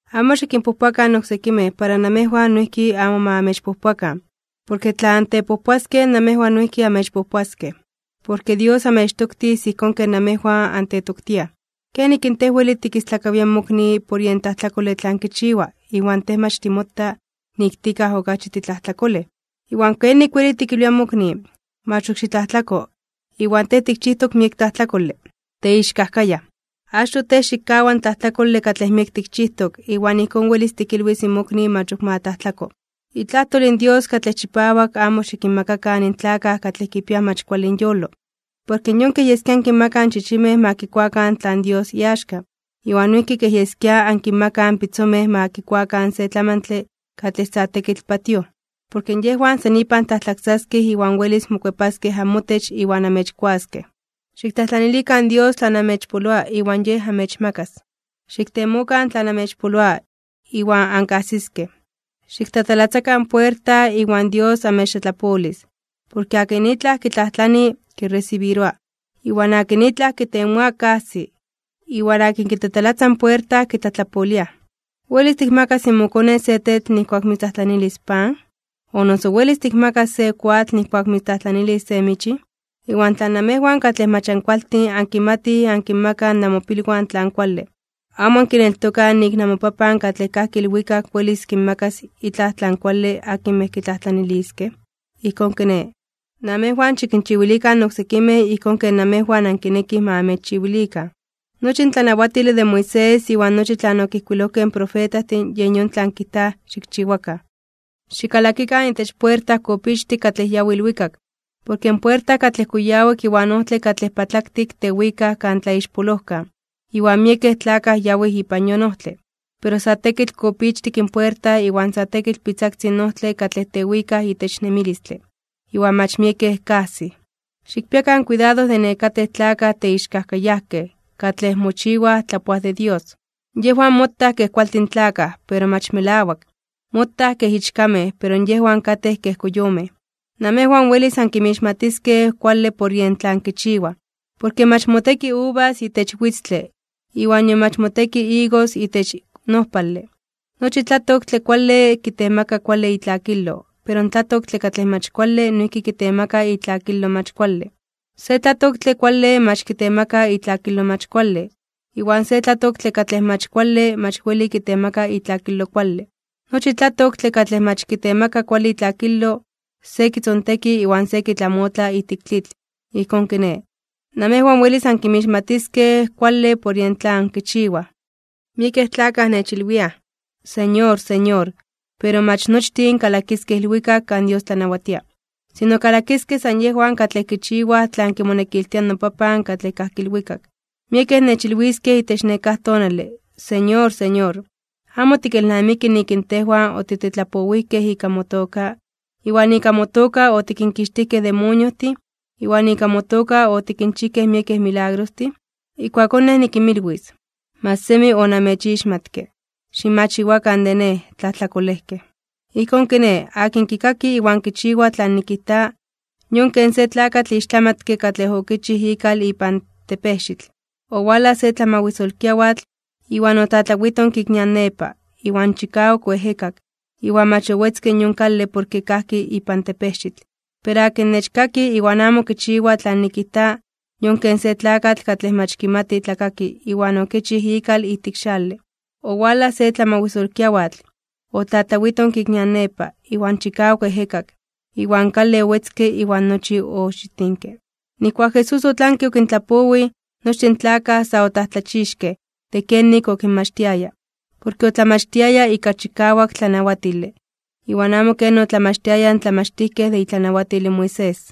’Amo xikinpojpoakan oksekimej, para namejwan noijki amo ma amechpojpoakan. Porke tla antepojpoaskej namejwan noijki amechpojpoaskej. Porke Dios amechtoktis ijkón ken namejwan antetoktiaj. ¿Kenik in tej weli tikistlakawia in mokni por yen tlajtlakole tlan kichiwa, iwan tej mach timota nik tikaj okachi titlajtlakolej? Iwan, ¿kenik weli tikilwia in mokni: “Mach ok xitlajtlako”, iwan tej tikchijtok miek tlajtlakole? ¡Teixkajkayaj! Achtoj tej xikkawa in tlajtlakole katlej miek tikchijtok, iwan ijkón welis tikilwis in mokni mach ok ma tlajtlako. ’Itlajtol in Dios katlej chipawak amo xikinmakakan in tlakaj katlej kipiaj mach kuale inyolo. Porke yon kej yeskia ankinmakaj in chichimej ma kikuakan tlan Dios iaxka, iwan noijki kej yeskia ankinmakaj in pitzomej ma kikuakan se tlamantle katlej sa tekitl patíoj. Porke yejwan san ipan tlajtlaksaskej iwan welis mokuepaskej amotech iwan amechkuaskej. ’Xiktlajtlanilikan Dios tlan amechpoloa, iwan Yej amechmakas. Xiktemokan tlan amechpoloa, iwan ankajsiskej. Xiktatalatzakan puerta, iwan Dios amechtlatlapolis. Porke akin itlaj kitlajtlani, kiresibiroa. Iwan akin itlaj kitemoa, kajsi. Iwan akin kitatalatza in puerta, kitlatlapoliaj. ’¿Welis tikmakas mokone se tetl nijkuak mitztlajtlanilis se pan? ¿O noso welis tikmakas se koatl nijkuak mitztlajtlanilis se michin? Iwan tla namejwan katlej mach ankualtin ankimatij ankinmakaj namopilwan tlan kuale, ¿amo ankineltokaj nik in namoPapan katlej kajki ilwikak welis kinmakas itlaj tlan kuale akinmej kitlajtlaniliskej? ’Ijkón kiné, namejwan xikinchiwilikan oksekimej ijkón ken namejwan ankinekij ma amechchiwilikan. Nochi in tlanawatile de Moisés iwan nochi tlan okijkuilojkej in profetajtin yen yon tlan kijtaj xikchiwakan. ’Xikalakikan itech puerta kopichtik katlej yawi ilwikak. Porke in puerta katlej kuyawak iwan ojtle katlej patlaktik tewikaj kan tlaixpolojkan, iwan miekej tlakaj yawij ipan yon ojtle. Pero sa tekitl kopichtik in puerta iwan sa tekitl pitzaktzin in ojtle katlej tewikaj itech nemilistle, iwan mach miekej kajsij. ’Xikpiakan kuidado de nekatej tlakaj teixkajkayajkej katlej mochiwaj tlapoaj de Dios. Yejwan motaj kej kualtin tlakaj, pero mach melawak, motaj kej ichkamej pero yejwan katej kej koyomej. Namejwan welis ankinmixmatiskej kuale por yen tlan kichiwaj. Porke mach moteki uvas itech witztle, iwan nion mach moteki igos itech nojpale. Nochi tlatoktle kuale kitemaka kuale itlakilo, pero in tlatoktle katlej mach kuale noijki kitemaka itlakilo mach kuale. Se tlatoktle kuale mach kitemaka itlakilo mach kuale, iwan se tlatoktle katlej mach kuale mach weli kitemaka itlakilo kuale. Nochi tlatoktle katlej mach kitemaka kuale itlakilo, se kitzonteki iwan se kitlamotla ijtik tlitl. Ijkón kiné, namejwan welis ankinmixmatiskej kuale por yen tlan kichiwaj. ’Miekej tlakaj nechilwiaj: “Señor, Señor”, pero mach nochtin kalakiskej ilwikak kan Dios tlanawatia. Sino kalakiskej san yejwan katlej kichiwaj tlan kimonekiltia in noPapan katlej kajki ilwikak. Miekej nechilwiskej itech nekáj tonale: “Señor, Señor, ¿amo tikelnamiki nik in tejwan otitetlapowijkej ika motoka, iwan ika motoka otikinkixtijkej demoniojtin, iwan ika motoka otikinchijkej miekej milagrostin?” Ijkuakón Nej nikinmilwis: “Mach semi onamechixmatke. Ximachiwakan de Nej, tlajtlakolejkej.” ’Ijkón kiné, akin kikaki iwan kichiwa tlan nikijta, yon ken se tlakatl ixtlamatke katlej okichij ikal ipan tepejxitl. Owalaj se tlamawisolkiawatl, iwan otlatlawitonke ik nian nepa, iwan chikawak oejekak, iwan mach owetzke in yon kale porke kajki ipan tepejxitl. Pero akin nechkaki iwan amo kichiwa tlan nikijta, yon ken se tlakatl katlej mach kimati tlakaki iwan okichij ikal ijtik xale. Owalaj se tlamawisolkiawatl, otlatlawitonke ik nian nepa, iwan chikawak oejekak, iwan kale owetzke iwan nochi oxitinke. Nijkuak Jesús otlanke okintlapowij, nochtin in tlakaj sa otlajtlachixkej (omomajmawtijkej) de kenik okinmachtiaya. Porke otlamachtiaya ika chikawak tlanawatile, iwan amo ken otlamachtiayaj in tlamachtijkej de itlanawatil in Moisés.